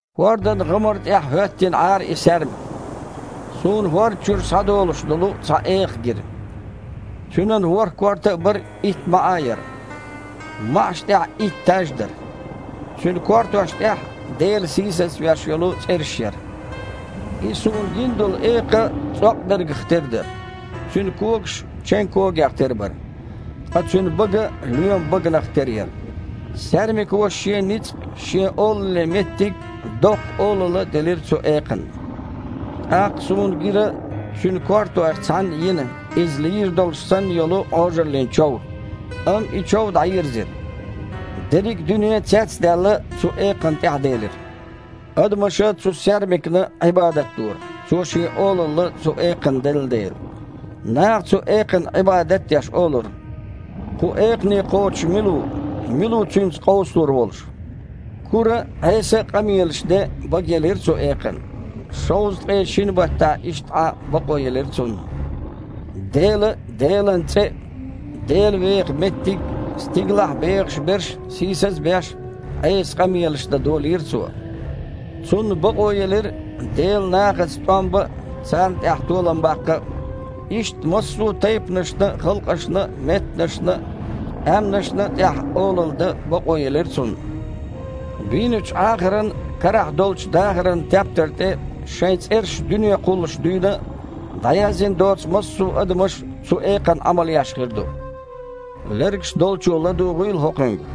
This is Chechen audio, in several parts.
ХІордан гІамар тІехь хІоьттина Іара и саьрмик. Суна хІорда чуьра схьадолуш долу цхьа экха гира. Цуьнан ворхІ корта а бара, итт маІа а яра. МаІаш тІехь итт таж дара. Цуьнан кортош тІехь Дела сийсазвеш йолу цІераш яра. И суна гина долу экха цІокъбергах тера дара. Цуьнан когаш чен когех тера бара. Ткъа цуьнан бага лоьман баганах тера яра. Саьрмико шен ницкъ а, шен олаллин меттиг а, доккха олалла а делира цу экханна. ТІаккха суна гира цуьнан кортойх цхьанна йина иза лийр долуш санна йолу Іожаллин чов, амма и чов дІайирзира. Дерриг а дуьне, цец а даьлла, цу экханна тІаьхьаделира. Адамаша цу саьрмикна Іибадат дора, цо шен олалла цу экханна делла дела. Наха, цу экханна Іибадат а деш, олура: «Кху экхане кхочуш мила ву? Мила ву цуьнца къовсалур волуш?» Кура а, Іеса а къамелаш ден бага елира цу экханна. Шовзткъе шина баттахь иштта Іан бакъо елира цунна. Дела а, Делан цІе а, Дела веха меттиг а, стигалахь бехаш берш а, сийсаз а беш, Іеса къамелаш дан долийра цо. Цунна бакъо елира Делан нахаца тІом бан а, царна тІехь толам баккха а. Иштта массо а тайпанашна а, халкъашна а, меттанашна а, къаьмнашна а тІехь олалла дан бакъо елира цунна. Бийначу Іахаран карахь долчу дахаран тептар тІе шайн цІераш дуьне кхуллуш дуьйна а дІаяздина доцу массо а адамаш цу экханна Іамал еш хир ду. Лергаш долчо ладугІийла хІокхуьнга.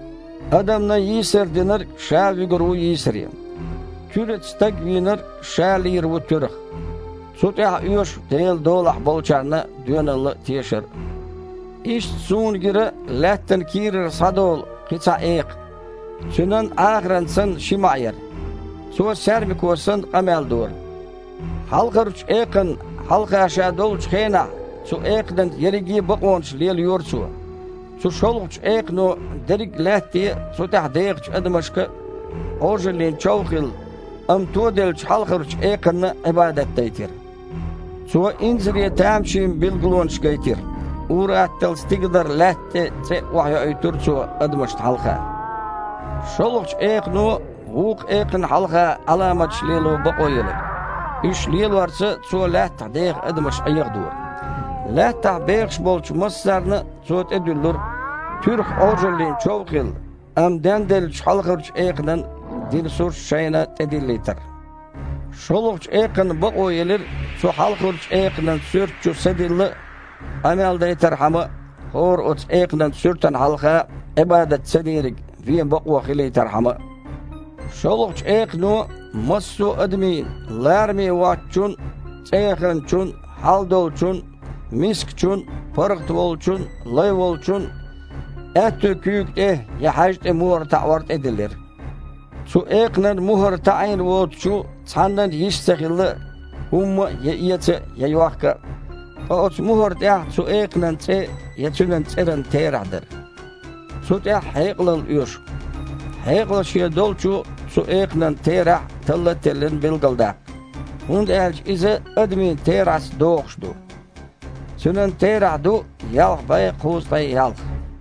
Адамна йийсар динарг ша а вуьгур ву йийсаре. Туьраца стаг вийнарг ша а лийр ву туьрах. Цу тІехь оьшу Делан долахь болчарна доьналла а, тешар а. Иштта суна гира лаьттан кийрара схьадолу кхин а цхьа экха. Цуьнан, Іахаран санна, ши маІа яра. Цо, саьрмико санна, къамел дора. Хьалхарчу экханна хьалха ша долчу хенахь, цу экханан ерриге а бакъонаш лелайора цо. Цу шолгІачу экхано дерриг а Лаьтте а, цу тІехь дехачу адамашка, а Іожаллин чов а хилла, амма тоделлачу хьалхарчу экханна Іибадат дайтира. Цо инзаре тамашийна билгалонаш гайтира. Ур-атталла стигалара лаьтта тІе цІе а охьайоуьйтура цо адамашна хьалха. ШолгІачу экхано вукху экханна хьалха Іаламаташ лело бакъо елира. Уьш лелорца цо лаьттахь деха адамаш Іехадора. Лаьттахь бехаш болчу массарна а цо тІедуьллура, туьрах Іожаллин чов а хилла, амма денделлачу хьалхарчу экханан дина сурт шайна тІедиллийтар. ШолгІачу экханна бакъо елира цу хьалхарчу экханан суьрта чу са дилла а, къамел дайтархьама а, хІора оцу экханан суьртана хьалха Іибадат цадийриг вен бакъо хилийтархьама а. ШолгІачу экхано массо а адамийн – лараме воцчун а, цІеяханчун а, хьалдолчун а, мискачун а, паргІат волчун а, лай волчун а – аьтту куьйга тІе я хьаьжа тІе мухІар таІор тІедиллира. Цу экханан мухІар таІийна воцучу цхьаннан а йиш ца хилла хІумма а я эца а, я йохка а. Ткъа оцу мухІар тІехь цу экханан цІе я цуьнан цІеран терахь дара. Цу тІехь хьекъалалла оьшу. Хьекъал шен долчо цу экханан терахь, талла а теллина, билгалдаккха. ХІунда аьлча иза адамийн терахьца догІуш ду. Цуьнан терахь ду ялх бІе кхузткъе ялх.